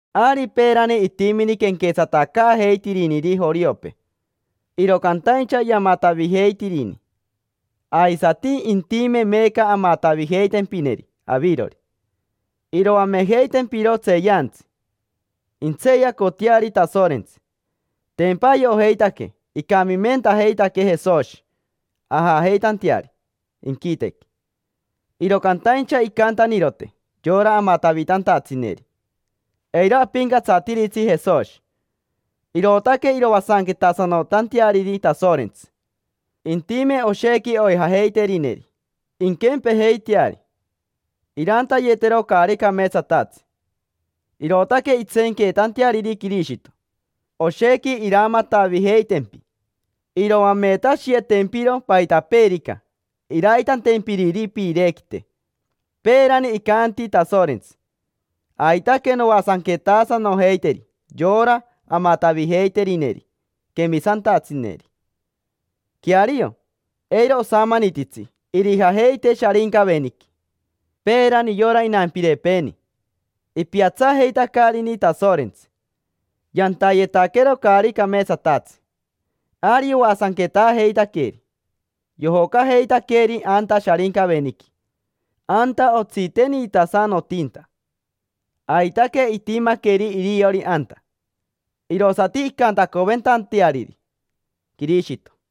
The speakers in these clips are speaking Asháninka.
Ari peerani itimini quenquetsatacaajeitiriniri joriopee, iro cantaincha yamatavijeitirini, aisati intime meeca amatavijeitempineri avirori. Iroamejeitempiro tseeyantsi, intseeyacoteari Tasorentsi. Tempa ayojeitaque icamimentajeitaquee Jesoshi ajajeitanteari inquitequi, iro cantaincha incantanirote yora amatavitantatsineri: “Eiro apincatsatiritsi Jesoshi”. Irootaque iroasanquetasanotanteariri Tasorentsi. Intime oshequi oijajeiterineri: inquempejeiteari, irantayetero caari cameetsatatsi; irootaque intseenqueetanteariri Quirishito. Oshequi iramatavijeitempi, iroametashiyetempiro paitapeerica iraitantempiriri piirequite. Peerani icanti Tasorentsi: “Aitaque noasanquetasanojeiteri yora amatavijeiterineri quemisantatsineri”. Queario, eiro osamanititsi irijajeite Sharincaveniqui. Peerani yora inampirepeeni, ipiatsajeitacarini Tasorentsi, yantayetaquero caari cameetsatatsi. Ari yoasanquetaajeitaqueri, yojocajeitaqueri anta Sharincaveniqui, anta otsiteniitasanotinta. Aitaque itimaqueri iriori anta, irosati incantacoventanteariri Quirishito.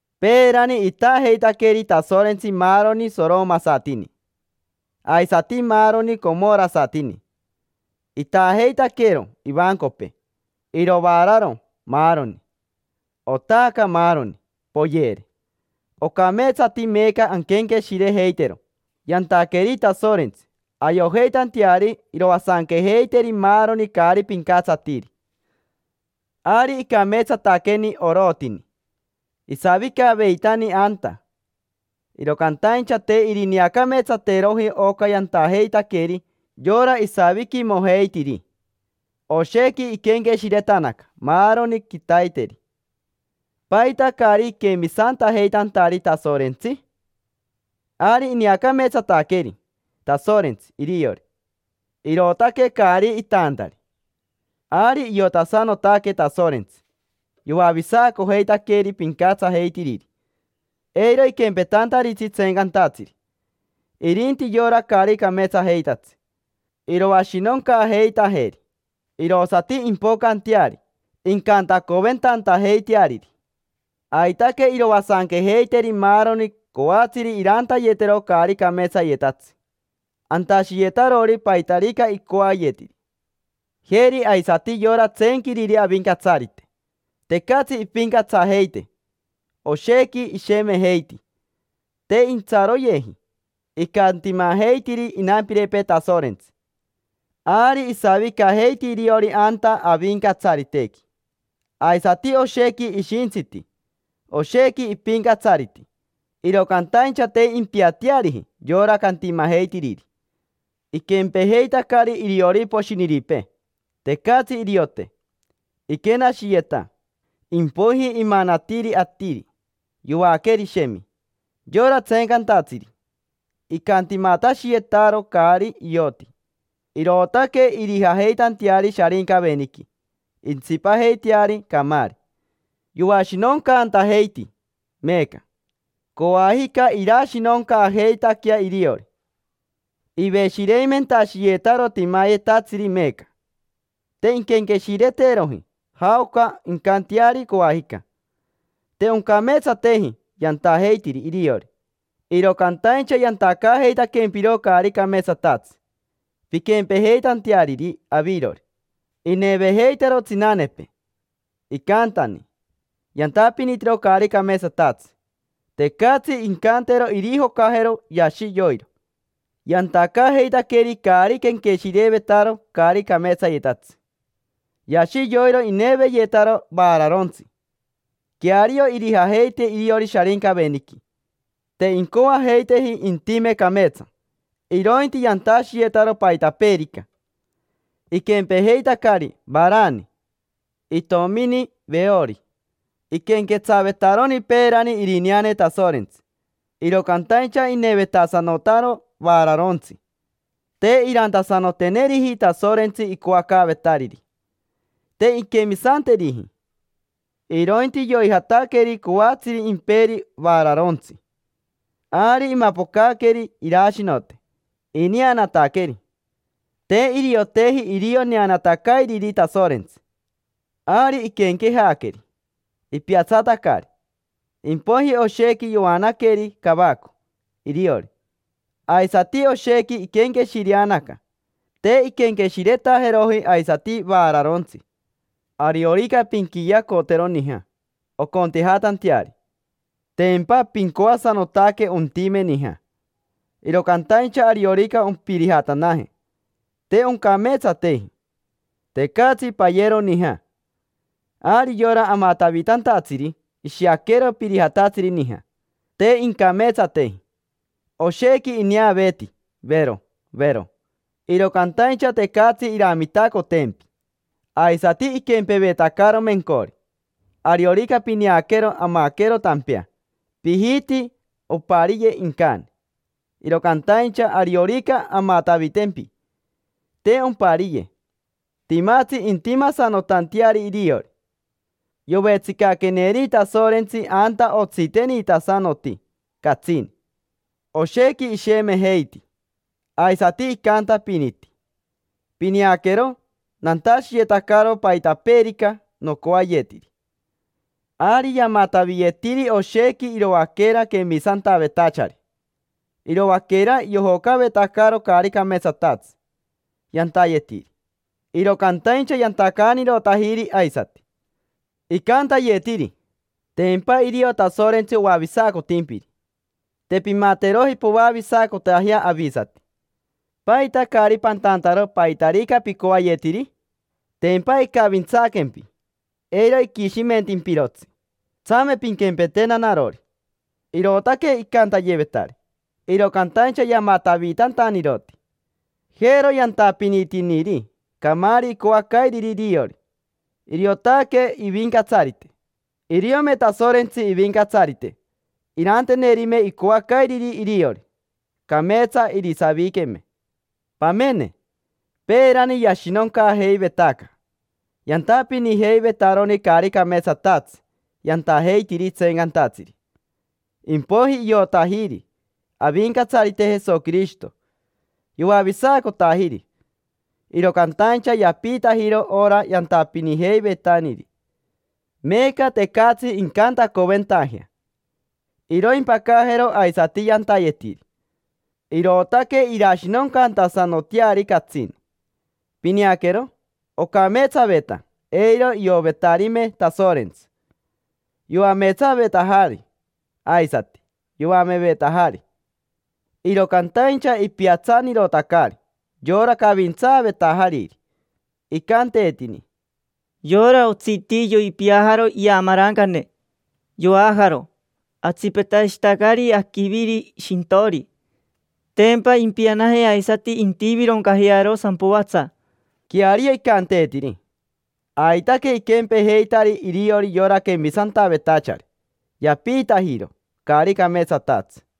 Peerani itaajeitaqueri Tasorentsi maaroni soromasatini, aisati maaroni comorasatini; itaajeitaquero ivancopee, irovararo, maaroni. Otaaca maaroni, poyere. Ocameetsati meeca anquenqueshirejeitero yantaqueri Tasorentsi ayojeitanteari iroasanquejeiteri maaroni caari pincatsatiri. Ari icameetsataqueni Orotini; isavicaveitani anta, iro cantaincha te irineacameetsateroji oca yantajeitaqueri yora isaviquimojeitiri. Oshequi iquenqueshiretanaca maaroni quitaiteri: “¿Paita caari iquemisantajeitantari Tasorentsi?” Ari ineacameetsataqueri Tasorentsi iriori, irootaque caari itaantari. Ari iotasanotaque Tasorentsi yoavisacojeitaqueri pincatsajeitiriri, eiro iquempetantaritsi tseencantatsiri. Irinti yora caari cameetsajeitatsi, iroashinoncaajeitajeri, irosati impocanteari incantacoventantajeiteariri. Aitaque iroasanquejeiteri maaroni coatsiri irantayetero caari cameetsayetatsi, antashiyetarori paitarica icoayetiri, jeri aisati yora tseenquiriri Avincatsarite. Tecatsi impincatsajeite, oshequi ishemejeiti, te intsaroyeji icantimajeitiri inampirepee Tasorentsi. Ari isavicajeiti iriori anta Avincatsaritequi, aisati oshequi ishintsiti, oshequi ipincatsariti, iro cantaincha te impiateariji yora cantimajeitiriri. Iquempejeitacari iriori poshiniripee, tecatsi iriote. Iquenashiyeta, impoiji imanatiri atiri, yoaqueri, shemi. Yora tseencantatsiri icantimatashiyetaro caari ioti, irootaque irijajeitanteari Sharincaveniqui, intsipajeiteari camaari. Yoashinoncantajeiti meeca: coajica irashinoncaajeitaquea iriori. Iveshireimentashiyetaro timayetatsiri meeca: te inquenqueshireteroji jaoca incanteari coajica. Te oncameetsateji yantajeitiri iriori, iro cantaincha yantacaajeitaquempiro caari cameetsatatsi pinquempejeitanteariri avirori. Inevejeitaro tsinanepee, icantani yantapinitiro caari cameetsatatsi: tecatsi incantero irijocajero, yashi yoiro. Yantacaajeitaqueri caari quenqueshirevetaro caari cameetsayetatsi. Yashi yoiro ineveyetaro vararontsi. Queario irijajeite iriori Sharincaveniqui. Te incoajeiteji intime cameetsa, irointi yantashiyetaro paitapeerica. Iquempejeitacari Varamani, itomini Veoro. Iquenquetsavetaroni peerani irineane Tasorentsi, iro cantaincha inevetasanotaro vararontsi, te irantasanoteneriji Tasorentsi icoacaavetariri. Te inquemisanteriji, irointi yoijataqueri coatsiri imperi vaararontsi. Ari imapocaqueri irashinote ineanataqueri. Te irioteji irio neanatacairiri Tasorentsi. Ari iquenquejaqueri, ipiatsatacari, impoiji oshequi yoanaqueri cavaco iriori, aisati oshequi iquenqueshireanaca: te inquenqueshiretajeroji aisati vaararontsi. Ariorica pinqueacotero nija oncontejatanteari, tempa pincoasanotaque ontime nija. Iro cantaincha ariorica ompirijatanaje, te oncameetsateji, tecatsi payero nija. Ari yora amatavitantatsiri ishiaquero pirijatatsiri nija: te incameetsateji. Oshequi ineaveeti, vero, vero, iro cantaincha tecatsi iramitacotempi. Aisati iquempevetacaro mencori, ariorica pineaquero amaquero tampea: pijiti ompariye incani, iro cantaincha ariorica amatavitempi, te ompariye. Timatsi intimasanotanteari iriori, yovetsicaqueneri Tasorentsi anta otsiteniitasanoti catsini. Oshequi ishemejeiti, aisati icantapiniti: “Pineaquero, nantashiyetacaro paitapeerica nocoayetiri”. Ari yamataviyetiri oshequi iroaquera quemisantavetachari: iroaquera yojocavetacaro caari cameetsatatsi yantayetiri, iro cantaincha yantacaanirotajiri aisati. Icantayetiri: “Tempa irio Tasorentsi oavisacotimpiri, te pimateroji poavisacotajea avisati. ¿Paita caari pantantaro paitarica picoayetiri? Tempa icavintsaaquempi, eiro iquishimentimpirotsi. Tsame pinquempetena narori”. Irootaque icantayevetari, iro cantaincha yamatavitantaniroti. Jero yantapinitiniri camaari icoacairiri iriori: iriotaque ivincatsarite. Iriome Tasorentsi ivincatsarite irantenerime icoacairiri iriori, cameetsa irisaviqueme. Pamene, peerani yashinoncaajeivetaca: yantapinijeivetaroni caari cameetsatatsi yantajeitiri tseencantatsiri. Impoiji iotajiri Avincatsarite Jesoquirishito, yoavisacotajiri. Iro cantaincha yapiitajiro ora yantapinijeiveitaniri. Meeca tecatsi incantacoventajea iroimpacajero aisati yantayetiri, irootaque irashinoncantasanoteari catsini. Pineaquero, ocameetsaveta eiro iovetarime Tasorentsi. Yoameetsavetajari, aisati yoamevetajari, iro cantaincha ipiatsanirotacari yora cavintsaavetajariri. Icanteetini: “Yora otsiti yoipiajaro iamarancane, yoajaro. Atsipetashitacari aquiviri shintori, tempa impianaje aisati intivironcajearo sampoatsa”. Queario icanteetiri. Aitaque iquempejeitari iriori yora quemisantavetachari, yapiitajiro caari cameetsatatsi.